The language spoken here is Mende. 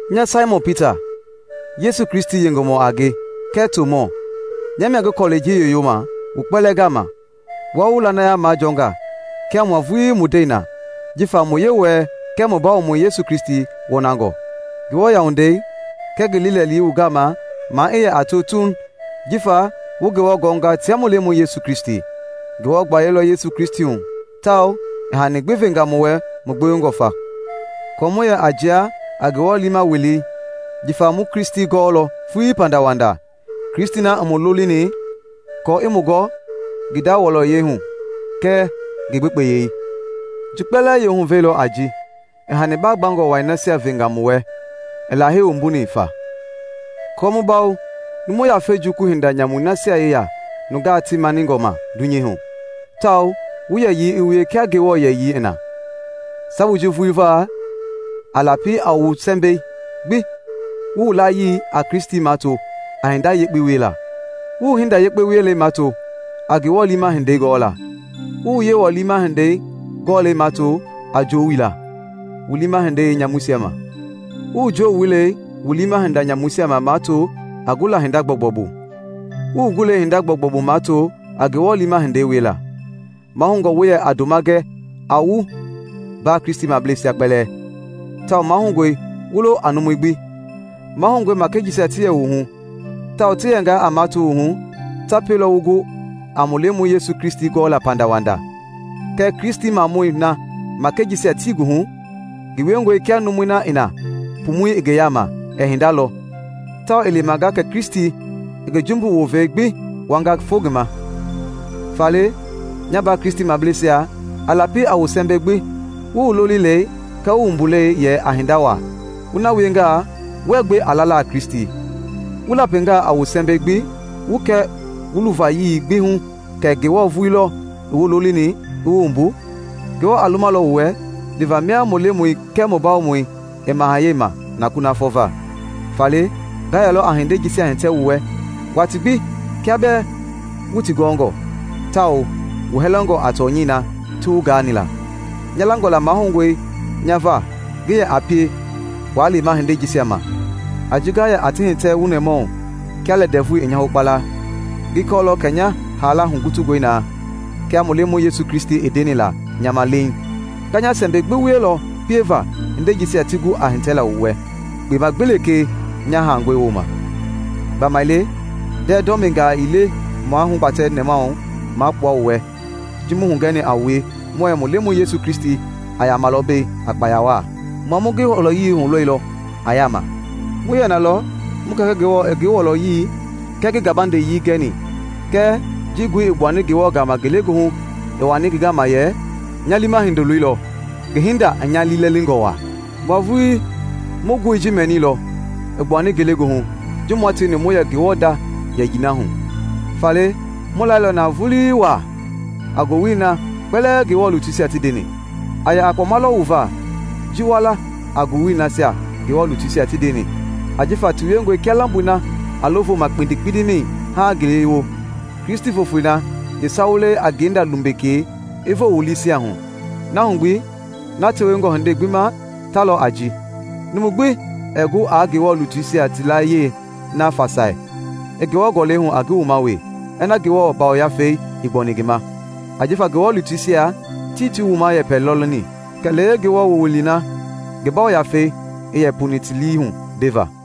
Nya Saimɔn Pita, Yesu Kristi yengemɔ a nge kɛɛ tomɔ, nya mia ngi kɔlɛi ji yoyoma, wu kpɛlɛɛ gama wua wu lanaya majɔɔnga kia mua vulii mu ndɛi na jifa mu Yewɔɛi kɛɛ mu Bawomɔi Yesu Kristi wɔnangɔ; Ngewɔ yauwandei kɛɛ ngi liilɛli wu gama maa i yɛ a to tuuŋ jifa wu Ngewɔ gɔnga tia mu Lemɔi Yesu Kristi. Ngewɔ gbayei lɔ Yesu Kristi hu tawao i hani gbi venga mu wɛ mu gbewengɔ fa kɔɔ mu yɛ a jia a Ngewɔ liima welei jifa mu Kristi gɔɔlɔ vulii pandawanda, Kristi na i mu lolini aako i mu gɔ ngi nda wɔlɔyei hu kɛɛ ngi gbekpeyii. Ji kpɛlɛɛ yeehuvɛi lɔ a ji i hani baa gbangɔ wai nasia venga mu wɛ i Lahei wumbuni fa aako mu bawo numu yafei jukulu hinda nyamui nasia yeya nungaa ti maningɔ ma dunyei hu, tawao wu yɛyii i wie kia Ngewɔ yɛyii i na. Sabui ji vulii va, a lapi a wu sɛmbɛi gbi wu wu layii a Kristi mato a hinda yekpe wiela, wu wu hinda yekpe wielei mato a Ngewɔ liima hindei gɔɔla; wu wu Yewɔ liima hindei gɔlɛi mato a joowila wu liima hinda nyamuisia ma, wu wu joowilɛi wu liima hinda nyamuisia ma mato a gula hinda gbɔugbɔu bu, wu wu gulɛi hinda gbɔugbɔu bu mato a Ngewɔ liima hindei wiela. Mahoungɔ wu yɛ a ndoma gɛ a wu mbaa Kristimableisia kpɛlɛɛ, tawao mahoungɔe wu lo a numui gbi. Mahoungɔe makɛi jisia ti yɛ wu hu tawao ti yɛngaa a mato wu hu, ta pielɔ wu gu a mu Lemɔi Yesu Kristi gɔɔla pandawanda. Kɛɛ Kristimamɔi na makɛi jisia tii ngi hu ngi wiengɔe kia numui na i na pumui i ngi yaama ɛɛ hinda lɔ, tawao i lemanga kɛ Kristi i ngi jumbu wovei gbi wuanga fo ngi ma. Faale, nya mbaa Kristimableisia, a lapi a wu sɛmbɛi gbi wu wu lolilei kɛɛ wu wumbulei yɛ a hinda waa; wu na wiengaa wuɛɛ gbe a lala a Kristi. Wu lapingaa a wu sɛmbɛi gbi wu kɛ wu luvayii gbi hu kɛ Ngewɔ vulii lɔ i wu lolini i wu wumbu, Ngewɔ a lumalɔ wu wɛ liva mia mu Lemɔi kɛɛ mu Bawomɔi i mahayɛi ma na kunafɔ va. Faale, nga yɛlɔ a hindei jisia hitɛ wu wɛ watii gbi kia bɛɛ wu ti gɔɔngɔ tawao wu hɛlɛngɔ a tɔnyɛi na ti wu gaani la. Nya langɔ la mahoungɔe nya va ngi yɛ a pie waa lema hindei jisia ma a ji nga yɛ a ti hitɛ wu nɛmahu kia lɛ ndɛvui i nya hokpala. Ngi kɔɔlɔ kɛ nya haala hugutungɔe naa kia mu Lemɔi Yesu Kristi i ndeni la nya ma leiŋ. Nga nya sɛmbɛi gbi wielɔ pieva hindei jisia ti gu a hitɛla wu wɛ kpema gbi lekee nya haangɔi wooma. Gbamaile ndɛɛ dɔmingaa ii le mua hugbatɛ nɛmahu maa kpua wu wɛ ji mu hugɛni a wue muɛɛ mu Lemɔi Yesu Kristi a yamalɔ mbei a kpaya waa. Mua mu ngi wɔlɔyei hulɔilɔ a yaama. Mu yɛ nalɔ mu Kɛkɛ Ngewɔ i ngi wɔlɔyii kɛɛ ngi gabandeyii gɛni kɛɛ ji ngoi i gbuani Ngewɔ gama ngelegoohu i wani ngi gama yɛ, “Nya liima Hindoloi lɔ, ngi hinda i nya liilɛlingɔ waa!” Mua vulii mu ngoi ji mɛniilɔ i gbuani ngelegoohu ji mua tieni mu yɛ Ngewɔ nda yiyei na hu. Faale mu lailɔ na vulii waa a ngowili na kpɛlɛɛ Ngewɔ lutuisia ti ndeni. A yɛ a kpɔma lɔ wu va ji wa la a ngowili nasia Ngewɔ lutuisia ti ndeni ajifa ti wiengɔe kia lamboi na a lo voma kpindi-kpindimɛi haaŋ ngele i wo, Kristi voofoi na yeesawulɛi a ngenda lumbekei i voo wu liisia hu. Na hu gbi, na tewengɔ hindei gbi ma ta lɔ a ji: numu gbi ɛɛ gu aa Ngewɔ lutuisia ti laayiɛi na fasai i Ngewɔ Gɔlɛi hu a ngi wuma wee ina Ngewɔ Yafei ii gbɔni ngi ma. Ajifa Ngewɔ lutuisia tii ti wuma yɛpɛ lɔ leni, kɛlee Ngewɔ wowili na ngi Yafei i yɛ pu ti lii hu ndeva.